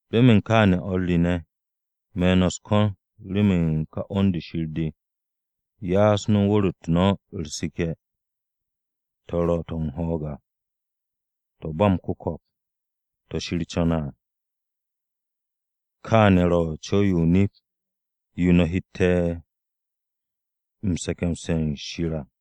Remen kaane̱, o̱r re ne̱, me̱ no̱ u̱s-ko̱n remen ka 'wo̱n-de Shir de, ya'as no̱ wu̱r-u̱t no̱ u̱t-seke̱, to̱ ro̱ to̱ u̱n ho̱o̱g à, to̱ u̱n ba m-ku̱ko̱p, to̱ Shir co̱ne̱ à. Kaane̱ ro̱ co̱w-yo o-nip yo no̱ hette̱ m-se̱ke̱mse̱ u̱n Shir à.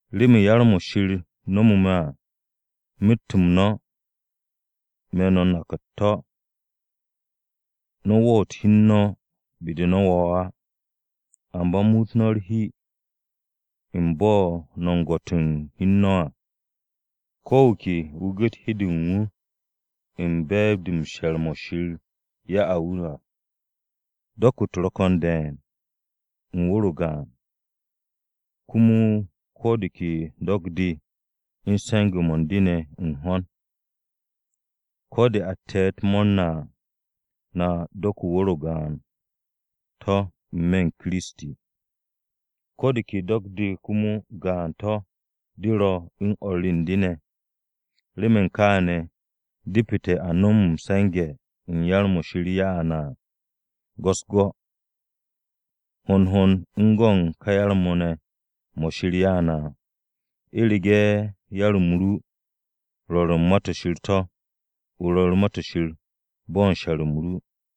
Remen yar-mo̱ Shir nomu̱ me̱ à, myet-m no̱, me̱ no̱ u̱n nak u̱t-to̱, no̱ woot hi u̱n no̱ u̱n be-de no̱ wo̱ á. Amba muut no̱ u̱r-hi u̱n bo̱ no̱ u̱n gwo̱t u̱n hi u̱n no̱ à, ko̱ wu̱ ke gu̱t hi u̱n de u̱n wu̱ u̱n be̱e̱b-de u̱n she̱r-mo̱ Shir ya'e̱ wu̱ à. Do̱k-u̱t ro̱ ko̱n de̱e̱n u̱n wu̱r-o gaan, komo ko̱ de ke do̱k-de u̱n se̱nge̱-mo̱ u̱n de ne̱ u̱n ho̱n. Ko̱ de atte̱ u̱t-mo̱o̱r ne̱ à, na do̱k-to̱ u̱n wu̱r-o o-gaan to̱ n-me̱ u̱n Kiristi, ko̱ de ke do̱k-de komo gaan-to̱ de ro̱ u̱n o̱r u̱n de ne̱. Remen kaane̱, depete̱ a no̱m m-se̱nge̱ u̱n yar-mo̱ Shir ya'u̱ na à, go̱-u̱s-go̱, hond hond u̱n go̱n ka yar-mo̱ ne̱ mo̱ Shir ya'a na à. U̱rege̱ yar-m ru rwo̱r u̱n Ma-to̱ Shir to̱, o ru̱r Ma-to̱ Shir bo̱ u̱n she̱r-m ru.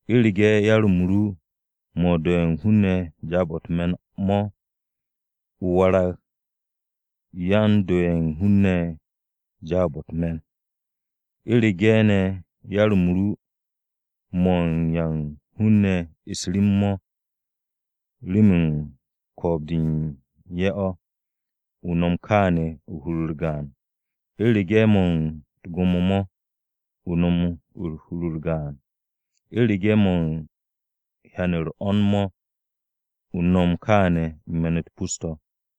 U̱rege̱ yar-m ru mo̱ u̱n do u̱n hun-ne̱ jaab-o̱ u̱t-me̱n mo̱, o warag yan-do'e̱ u̱n hun-ne̱ jaab-o̱ u̱t-me̱n. U̱rege̱ ne̱ yar-m ru mo̱ u̱n 'ya u̱n hun-ne̱ u̱s-rem mo̱, remen ko̱o̱b-de u̱n ye̱ o̱, o no̱m kaane̱ hur-u̱r gaan. U̱rege̱ mo̱ u̱t-gwo̱mo mo̱, o no̱m to̱ hur-u̱r gaan. U̱rege̱ mo̱ u̱n hyan u̱r-'wo̱n mo̱, o no̱m kaane̱ u̱n me̱n-u̱t pus-to̱.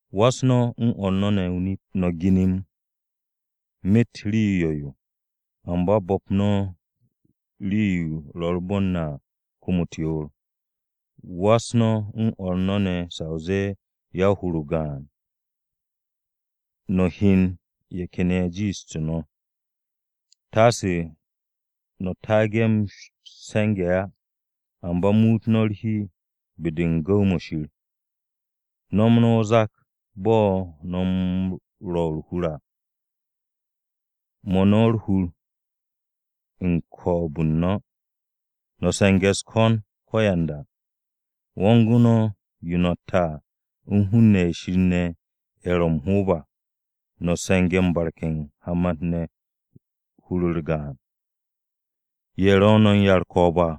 Was no̱ u̱n o̱r no̱ ne̱ o-nip. No̱ ginim myet rii yo̱-yo, amba bo̱p no̱ rii-yo ro̱ u̱r-bon ne̱ à kom-u̱t yoor. Was no̱ u̱n o̱r no̱ ne̱ sa o zee yan-hur-o gaan, no̱ hyen ye̱ ken jiishtu̱ no̱. Taase no̱ taage̱ m-se̱nge̱ á, amba muut no̱ u̱r-hi be-de u̱n gu̱w-mo̱ Wan-Ko̱yan. No̱m no̱ o-zak bo̱ no̱ m-rwo̱ u̱r-hur à. 'Mo̱ no̱ u̱r-hur u̱n ko̱o̱b u̱n no̱. No̱ se̱nge̱ u̱s-ko̱n ko̱yanda. Wong no̱ yo no̱tte̱ à u̱n hun-ne̱ ye̱ Shir ne̱ ye̱ ro̱ o-hoob à. No̱ se̱nge̱ barke̱ u̱n hamat-ne̱ hur-u̱r gaan. Ye̱ ro̱ no̱ u̱n ya-u̱r-ko̱o̱b à,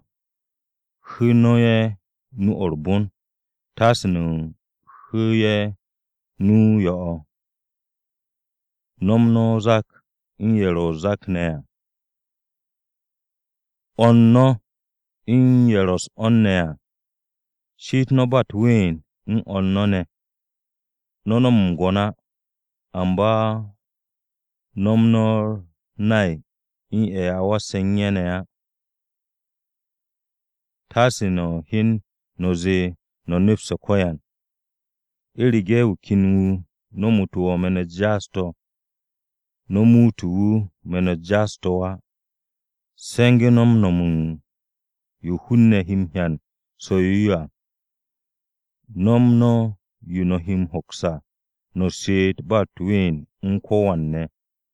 hu̱u̱ no̱ ye̱ nu-o u̱r-bon. Taase no̱ hu̱u̱ ye̱ nu yo̱-o̱. No̱m no̱ o-zak u̱n ye̱ ro̱ o-zak ne̱ à, 'wo̱n no̱ u̱n ye̱ ro̱ u̱s-'wo̱n ne̱ à. She'et no̱ ba u̱t-ween u̱n o̱r no̱ ne̱ ne̱. No̱ no̱m m-gwo̱n á, amba no̱m no̱ u̱r-nay u̱n ye̱ a wasse̱ ne̱ á. Taase no̱ hyen no̱ zee no̱ nepste̱ ko̱yan kap. U̱rege̱ wu̱ ken wu̱ nomote̱ no̱ me̱n-u̱t jaas-to̱, no̱ muute̱ wu̱ me̱n-u̱t jaas-to̱ á. Se̱nge̱ no̱ nom yo hun-ne̱ he m-hyan so̱-yo à. No̱m no̱ yo no̱ he m-hoks à, no̱ she'et ba u̱t-ween u̱n ko̱wan ne̱.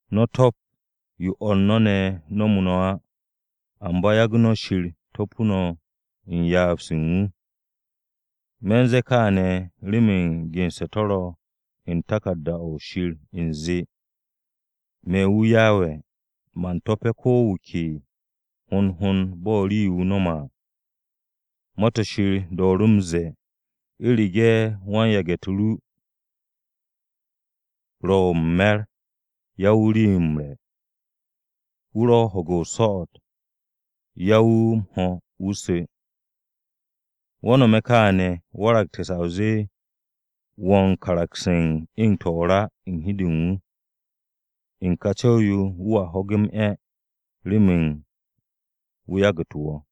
No̱ to̱p yo o̱r no̱ ne̱ no̱mu̱ no̱ á, amba yagu̱ no̱ Shir topotu̱ no̱ u̱n ryaab-se u̱n wu̱. Me̱ u̱n ze̱e̱ kaane̱ remen gense̱ to̱ ro̱ u̱n Taku̱rda-o̱ Shir u̱nze, “Me̱ wu̱ Yawe, man to̱pe̱ ko̱ wu̱ ke hond hond bo̱ u̱n rii-yo wu̱ no̱me̱ à.” Ma-to̱ Shir dooru̱ m-ze̱e̱, “U̱rege̱ wan-yage̱-u̱t ru ro̱ u̱n me̱r, 'ya wu̱ rii-yo m-re̱. Wu̱ ro̱ m-ho̱ge̱ o-swo̱o̱t, 'ya wu̱ m-ho̱ wu̱ su̱. Wo̱ no̱me̱ kaane̱ waragte̱ sa o zee wo̱ u̱n karakse̱ u̱n eng-to̱ o-ra u̱n hi-de u̱n wu̱. U̱n ka co̱w-yo, wo̱a ru̱ wu̱ ho̱ge̱ m-'e̱ remen wu̱ yagu̱te̱ wo̱.”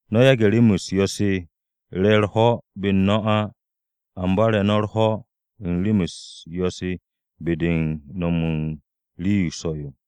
No̱ yage̱ rem-u̱s yo̱-se re̱ u̱r-ho̱ be-u̱r no̱ á, amba re̱ no̱ u̱r-ho̱ u̱n rem-u̱s yo̱-se be-de u̱n no̱m u̱n rii so̱-yo.